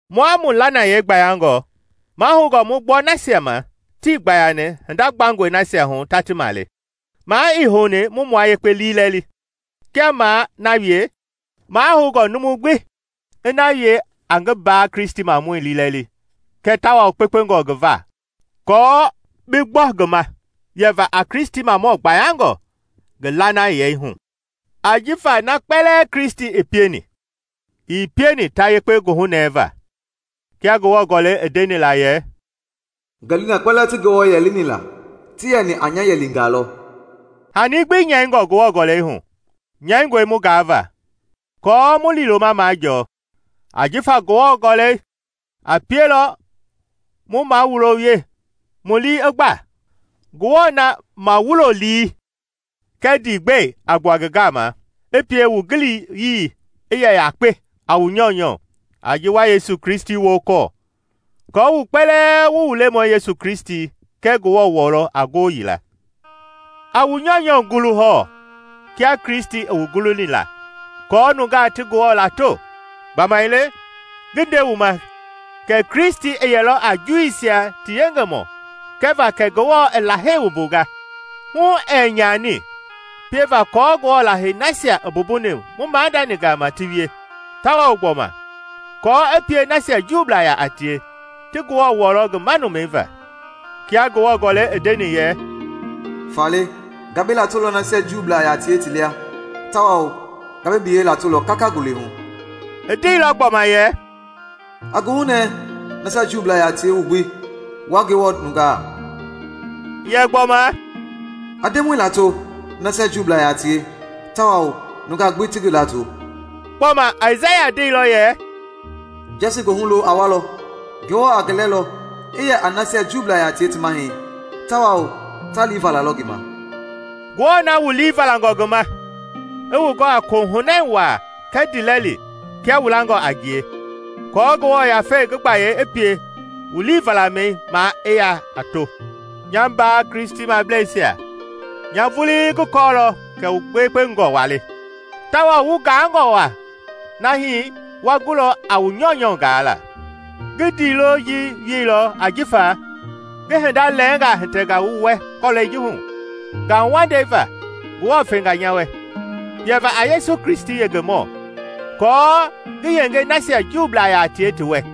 Mua mu lanayei gbayangɔ mahoungɔ mu gbɔ nasia ma tii gbayani hinda gbangɔi nasia hu ta ti male. Maa ii houni mu mua yekpe liilɛli. Kia maa na wie, mahoungɔ numu gbi i na wie a ngi mbaa-Kristimamɔi liilɛli kɛɛ tawao kpekpengɔ ngi va aako bi gbɔ ngi ma yɛva a Kristimamɔ gbayangɔ ngi lanayei hu. Ajifa na kpɛlɛɛ Kristi i pieni, ii pieni ta yekpe goohunɛɛva, kia Ngewɔ Gɔlɛi i ndeni la yɛ, “Ngɛlii na kpɛlɛɛ ti Ngewɔ yɛlini la ti yɛni a nya yɛlingaa lɔ.” Hani gbi nyɛingɔ Ngewɔ Gɔlɛi hu, nyɛingɔe mu gaava, aako mu liiloma majɔɔ, ajifa Ngewɔ Gɔlɛi a pielɔ mu mawulo wie, mu lii i gba. Ngewɔ na mawulo-lii kɛɛ ndiigbɛi a gbua ngi gama, i pie wu giliyii i yɛ yakpe a wu nyɔunyɔ a ji wa Yesu Kristi wokɔɔ, aako wu kpɛlɛɛ wu mu Lemɔi Yesu Kristi kɛɛ Ngewɔ wɔlɔ a ngoo yila. A wu nyɔunyɔ gulu hɔɔ kia Kristi i wu guluni la aako nungaa ti Ngewɔ lato. Gbamaile, ngi nde wu ma, kɛ Kristi i yɛlɔ a Juuisia ti yengemɔ kɛva kɛ Ngewɔ i Lahei wumbungaa, hu ɛɛ nyani, pieva kɔɔ Ngewɔ Lahei nasia i mbumbuni mu maadani gama ti wie, tawao gbɔma aako i pie nasia Juublaa yaa tie ti Ngewɔ wɔlɔ ngi manumɛi va. Kia Ngewɔ Gɔlɛi i ndeni yɛ, “Faale nga bi latolɔ nasia Juublaa yaa tie ti lia, tawao nga bi biyɛi latolɔ kaka ngule hu.” I ndeilɔ gbɔma yɛ, “A goohunɛ, nasia Juublaa yaa tie wu gbi, wua Ngewɔ nungaa!” Yɛ gbɔma, “A Ndemɔi lato, nasia Juublaa yaa tie; tawao nungaa gbi ti ngi lato!” Gbɔma, Aisaya ndeilɔ yɛ, “Jɛsi goohu lo a walɔ, Ngewɔ a ngi lɛlɔ i yɛ a nasia Juublaa yaa tie ti mahɛi tawao ta lii valalɔ ngi ma.” Ngewɔ na wu lii valangɔ ngi ma, i wu gɔ a kohunɛi waa kɛɛ ndiilɛli kia wu langɔ a ngie, aako Ngewɔ Yafei ngi gbayei i pie wu liivalamɛi maa i yaa a to. Nya mbaa Kristimableisia nya vulii ngi kɔɔlɔ kɛ wu gbekpengɔ waa le, tawao wu gaangɔ waa nahi wa gulɔ a wu nyɔunyɔ gaala. Ngi ndiilo ji wielɔ jifa ngi hinda lɛɛngaa hitɛnga wu wɛ kɔlɛi ji hu, ngauwandei va Ngewɔ fenga nya wɛ, yɛva a Yesu Kristi yengemɔ aako ngi yenge nasia Juublaa yaa tie ti wɛ.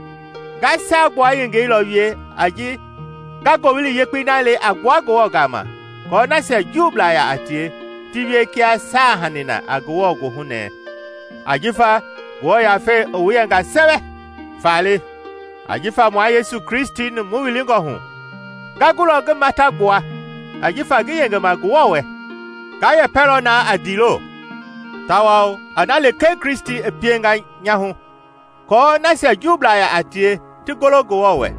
Nga saagbua yengei lɔ wie a ji nga Ngowili Yekpei na le a gbua Ngewɔ gama aako nasia Juublaa yaa tie ti wie kia saahanii na a Ngewɔ goohu nɛɛ ajifa Ngewɔ Yafei i wu yɛnga sɛwɛ. Faale, ajifa mua Yesu Kristi mu wilingɔ hu, nga gulɔ ngi mata gbua ajifa ngi yengema Ngewɔ wɛ. Nga yɛpɛlɔ naa a ndiilo, tawao a na lekee Kristi i pienga nyahu kɔɔ nasia Juublaa yaa tie ti golo Ngewɔ wɛ,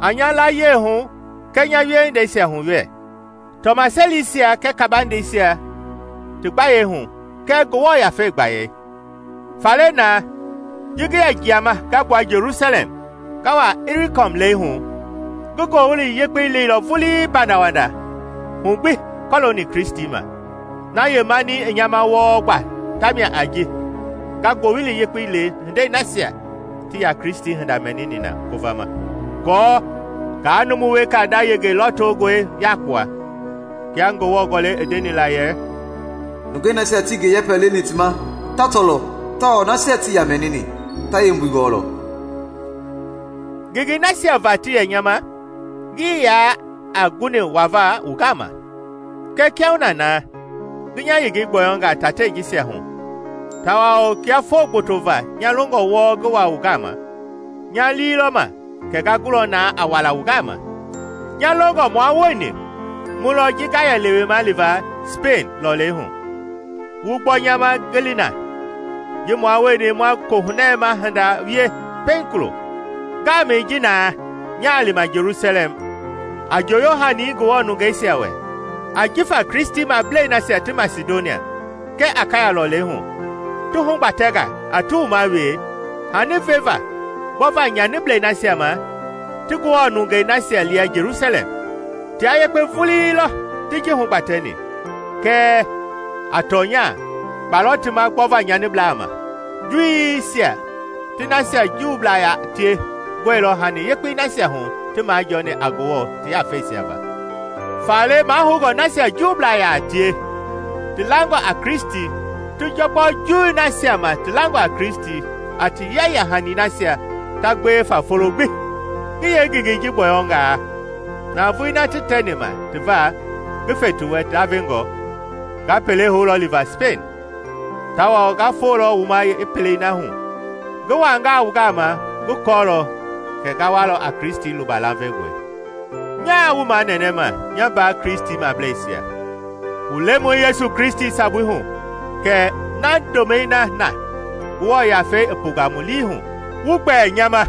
a nya layie hu kɛɛ nya wiehindeisia hu wɛ, tɔmaselisia kɛɛ kabandeisia ti gbayei hu kɛɛ Ngewɔ Yafei gbayei. Faale naa, ji ngi yɛ jiama nga gbua Jelusalɛm nga wa Ilirikɔm lɛihu, ngi Ngowili Yekpei leilɔ vulii pandawanda hu gbi kɔlooni Kristi ma. Na yeemani i nya ma wɔɔ gba ta mia a ji nga Ngowili Yekpei le hindei nasia tii yaa Kristi hinda mɛnini na ngovama, aako ngaa numu weka nda yenge lɔtongɔi yakpua. Kia Ngewɔ Gɔlɛi i ndenila yɛ, “Nungei nasia tii ngi yɛpɛ leni ti ma ta tɔlɔ, tawao nasia tii yaa mɛnini ta yeembui gɔɔlɔ.” Ngengei nasia va ti yɛ nya ma, ngii yaa a guni wava wu gama. Kɛɛ kiahuna naa ngi nya yengei gbɔyɔnga tatei jisia hu tawao kia foo gboto va nya longɔ wɔɔ ngi wa wu gama, nya lii lɔ ma kɛ nga gulɔ naa a wala wu gama. Nya longɔ mua wueni mu lɔ ji nga yɛ lewema liva Sipeiŋ lɔleihu, wu gbɔ nya ma ngi li na, ji mua wueni ma kohunɛma hinda wie pɛiŋ kulo. Ngaamɛi ji naa nyaa lima Jelusalɛm a njoyo-hani Ngewɔ nungeisia wɛ. Ajifa Kristimablei nasia ti Masidonia kɛɛ Akaya lɔleihu ti hugbatɛnga a ti wuma wee hani veva gbɔva nyaniblɛi nasia ma ti Ngewɔ nungei nasia lia Jelusalɛm. Tia yekpe vulii lɔ ti ji hugbatɛni. Kɛɛ, a tɔnya, kpa lɔ ti ma gbɔva nyaniblaa ma; Juuisia ti nasia Juublaa yaa tie gɔilɔ hani yekpei nasia hu ti majɔɔni a Ngewɔ ti yafeisia va, faale mahoungɔ nasia Juublaa yaa tie ti langɔ a Kristi ti gbɔ Juu nasia ma ti langɔ a Kristi a ti yeya-hani nasia ta gbewe fa folo gbi. Ngi yeengengei ji gbɔyɔngaa, navoei na ti tɛni ma ti va ngi fe ti wɛ ndavengɔ, nga pele houlɔ liva Sipeiŋ, tawao nga folɔ wu ma yeepelei hu. Ngi wangaa wu gama, ngi kɔɔlɔ kɛ nga walɔ a Kristi luba lavengɔi. Nyaa wu manɛnɛma, nya mbaa Kristimableisia, mu Lemɔi Yesu Kristi sabui hu kɛɛ naa ndomɛi na Ngewɔ Yafei i punga mu lii hu, wu gbɛɛ nya ma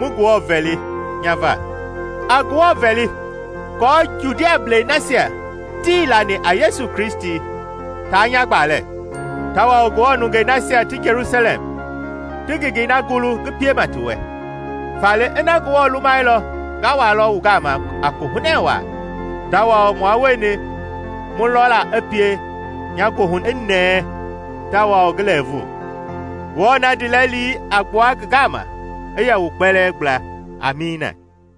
mu Ngewɔ vɛli nya va. A Ngewɔ vɛli aako Judiablɛi nasia tii lani a Yesu Kristi taa nya gbalɛ, tawao Ngewɔ nungei nasia ti Jelusalɛm ti ngengei na gulu ngi piema ti wɛ. Faale ina Ngewɔ lumailɔ nga walɔ wu gama a kohunɛ waa, tawao mua wueni mu lɔla i pie nya goohu i nɛɛ tawao ngi lɛɛvu. Ngewɔ na ndiilɛli a gbua ngi gama, i yɛ wu kpɛlɛɛ gbla. Amiina.